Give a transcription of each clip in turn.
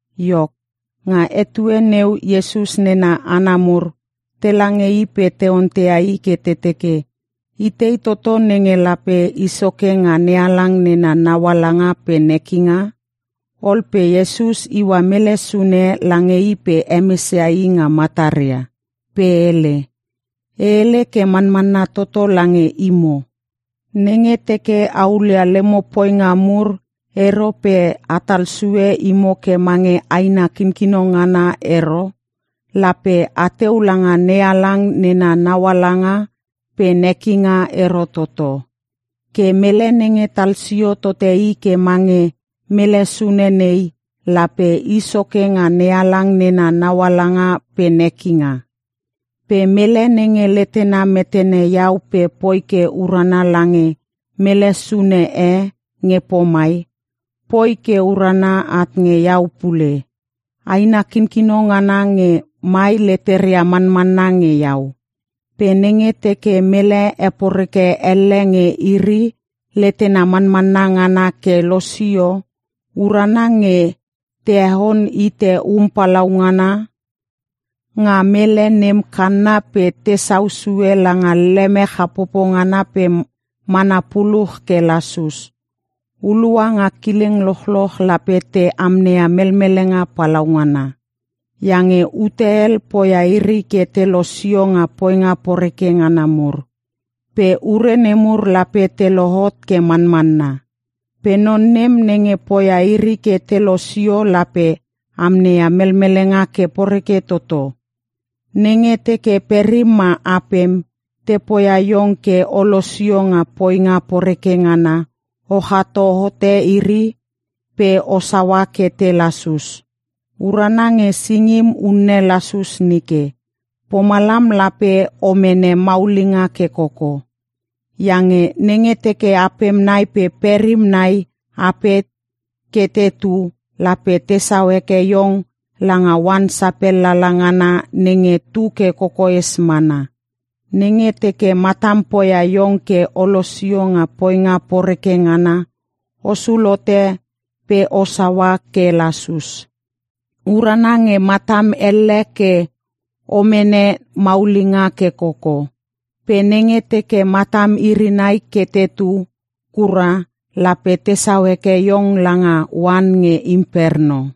Iok, nga etue neu Iesus nena hana mur tela nge i pe te onteia i ke te teke, “Itei toto nenge lape i soke nga NeHalang nena naualanga pe nekinga?” Ol pe Iesus iua mele sune lange i pe hemes ia i nga mataria. Pe hele, “E hele ke manmanna toto lange imo, nenge teke a hulia lemo poinga mur ero pe a tal sue imo ke mange aina kinkino ngana ero, lape ateu langa NeHalang nena naualanga pe nekinga ero toto. Ke mele nenge talsio tote i ke mange mele sune nei, lape i soke nga NeHalang nena naualanga pe nekinga. “Pe mele nenge letena metene Iau pe poi ke urana lange mele sune e nge pomai, poi ke urana at nge Iau pule. Aina kinkino ngana nge mai leteria manmanna nge Iau. Pe nenge teke mele heporeke elle nge iri letena manmanna ngana ke losio, urana nge te heon hite um palaungana nga mele nem kanna pe tesau sue langa leme chapopo ngana pe mana puluch ke lasus. “Hulua nga kileng lochloch lape te amneia melmelenga palaungana. Iange ute hel poia iri ke te losio nga poinga poreke ngana mur. Pe ure nemur lape te lohot ke manmanna. Pe non nem nenge poia iri ke te losio lape amneia melmelenga ke poreke toto! Nenge teke perim ma apem, te poia iong ke o losio nga poinga poreke ngana, o chato hote iri pe o saua ke te lasus. Urana nge singim unne lasus nike. Pomalam lape o mene maulinga ke koko. Iange nenge teke apem nai pe perim nai ape ke tetu, lape tesau heke iong langa oan sapel lala ngana nenge tu ke kokoes mana. Nenge teke matam poia iong ke o losio nga poinga poreke ngana, o sul hote pe o saua ke lasus. Urana nge matam elle ke o mene maulinga ke koko. Pe nenge teke matam iri nai ke tetu kura lape tesau heke iong langa oan nge Imperno.”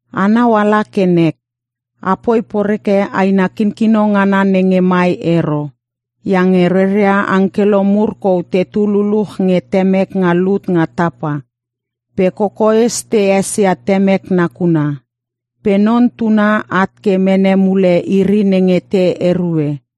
“Anau ala ke nek! A poi poreke aina kinkino ngana nenge mai ero. Iange reria angkelo mur kou tetu luluch nge Temek nga lut nga tapa. Pe kokoes te esesia Temek nakuna. [ Pe Non Tuna at ke mene mule iri nenge te erue.]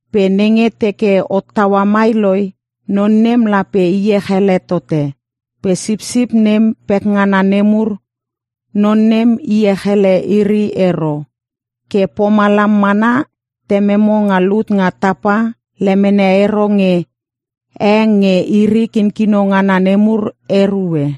Pe nenge teke hottaua mai loi, non nem lape iech ele tote. Pe sipsip nem pekngana nemur, non nem iech ele iri ero. Ke pomalam mana, Tememo nga lut nga tapa lemene ero nge e nge iri kinkino ngana nemur erue.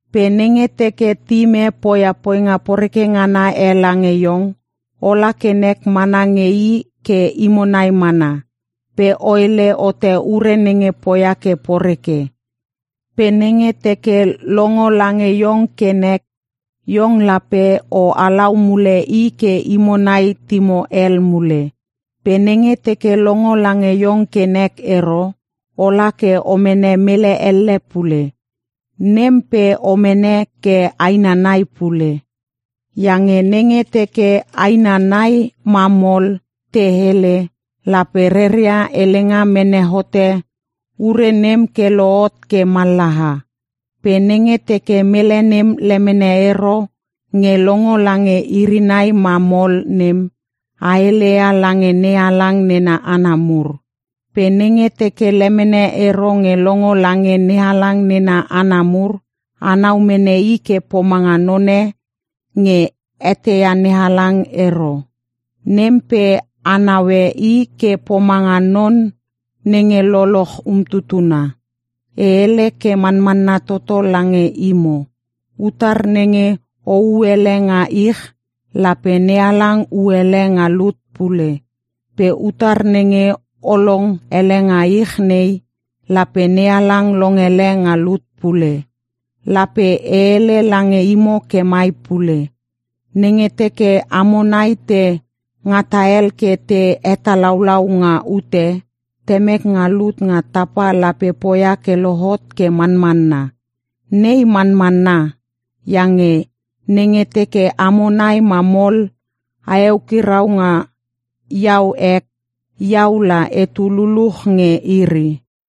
“Pe nenge teke tim e poia poinga poreke ngana e lange iong, ola ke nek mana nge i ke imo nai mana, pe o hele hote ure nenge poia ke poreke. Pe nenge teke longo lange iong ke nek, iong lape o halau mule i ke imo nai timo hel mule. Pe nenge teke longo lange iong ke nek ero, ola ke o mene mele elle pule. Nem pe o mene ke aina nai pule. Iange nenge teke aina nai ma mol te hele, lape reria helenga mene hote ure nem ke lohot ke mallaha. Pe nenge teke mele nem lemene ero nge longo lange iri nai ma mol nem, a heleia lange NeHalang nena hana mur. Pe nenge teke lemene ero nge longo lange NeHalang nena hana mur, anau mene i ke pomanga none nge eteia NeHalang ero. Nem pe a naue i ke pomanga non nenge lololoch umtutuna. “E hele ke manmanna toto lange imo, utar nenge o hu hele nga ich, lape NeHalang hu hele nga lut pule. Pe utar nenge o long hele nga ich nei, lape NeHalang long hele nga lut pule. “Lape e hele lange imo ke mai pule, Nenge teke amo nai te ngata hel ke te hetalaulau nga ute, Temek nga lut nga tapa lape poia ke lohot ke manmanna. Nei manmanna, iange nenge teke amo nai ma mol a eukirau nga Iau ek, Iau la etu luluch nge iri.”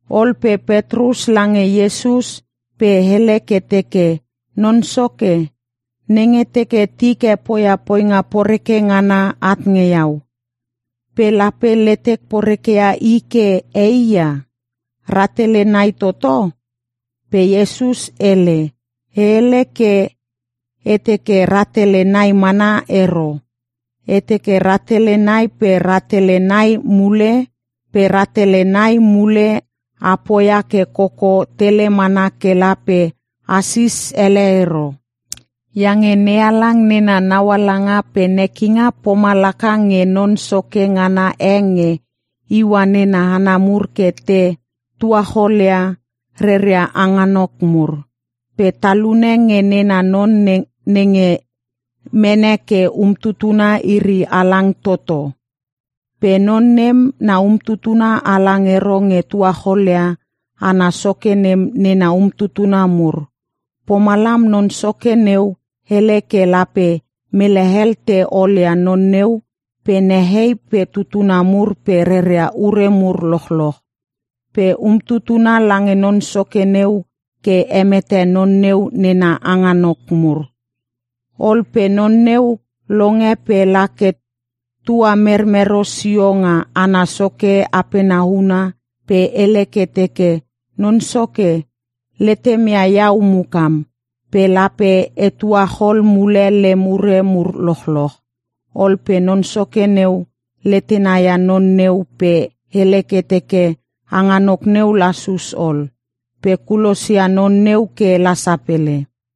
Ol pe Petrus lange Iesus pe hele ke teke, “Non Soke, nenge teke tik e poia poinga poreke ngana at nge iau, pe lape letek porekeia i ke e hia? Ratele nai toto?” Pe Iesus hele, “E hele ke e teke rahtele nai mana ero. E teke rahtele nai pe rahtele nai mule pe rahtele nai mule a poia ke koko tele mana kela pe a sis ele ero. “Iange NeHalang nena naualanga pe nekinga pomalaka nge non soke ngana e nge iua nena hana mur ke te tuacholcholia reria hanganok mur. Pe talune nge nena non nenge mene ke umtutuna iri halang toto (1-milion kina). Pe non nem na umtutuna halang ero nge tuacholia ana soke nem nena umtutuna mur. Pomalam non soke neu hele ke lape mele hel te olia non neu pe nehei pe tutuna mur pe reria ure mur lochloch. Pe umtutuna lange non soke neu ke hemete non neu nena hanganok mur. “Ol pe non neu longe pe la ke tua mermero sio nga ana soke apena huna pe hele ke teke, ‘Non soke, letem ia iau mukam, pe lape e tuachol mule lem ure mur lochloch.’ Ol pe non soke neu letena ia non neu pe hele ke teke hanganok neu lasus ol. Pe kulosia non neu kela sapele.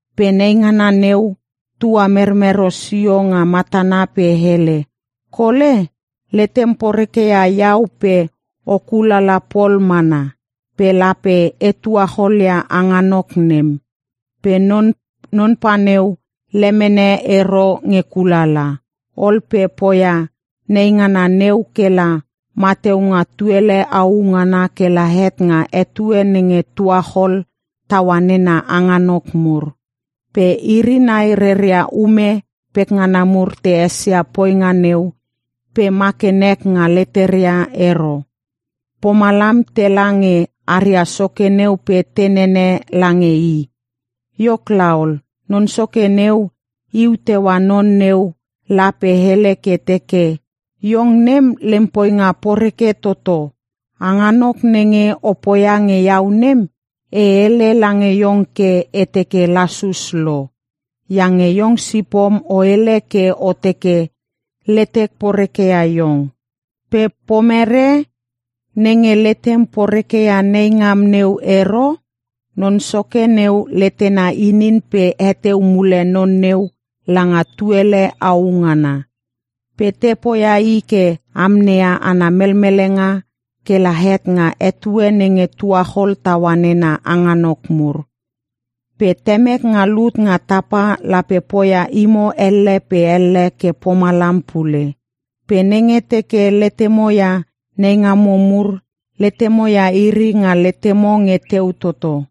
“Pe neingana neu tuamermero sio nga matana pe hele, ‘Kole, letem poreke ia iau pe o kulala pol mana, pe lape e tuachol ia hanganok nem.’ “Pe non pa neu lemene ero nge kulala. Ol pe poia neingana neu kela mateu nga tuele au ngana kela het nga etue nenge tuachol taua nena hanganok mur. Pe iri nai reria ume pekngana mur te esia poinga neu pe ma ke nek nga leteria ero. Pomalam tela nge aria soke neu pe te nene lange i. “Iok laol, non soke neu iu teua non neu la pe hele ke teke, ‘Iong nem, lem poinga poreke toto! Hanganok nenge o poia nge iau nem, e hele lange iong ke e teke lasus lo. Iange iong sipom o hele ke o teke letek poreke ia iong. Pe pomere nenge letem poreke ia neingam neu ero?’ Non soke neu letena inin pe heteu mule non neu langa tuele au ngana. Pe te poia i ke amneia ana melmelenga kela het nga etue nenge tuachol taua nena hanganok mur. “Pe Temek nga lut nga tapa lape poia imo elle pe elle ke pomalam pule. Pe nenge teke letemo ia neingamo mur, letemo ia iri nga letemo nge teu toto.”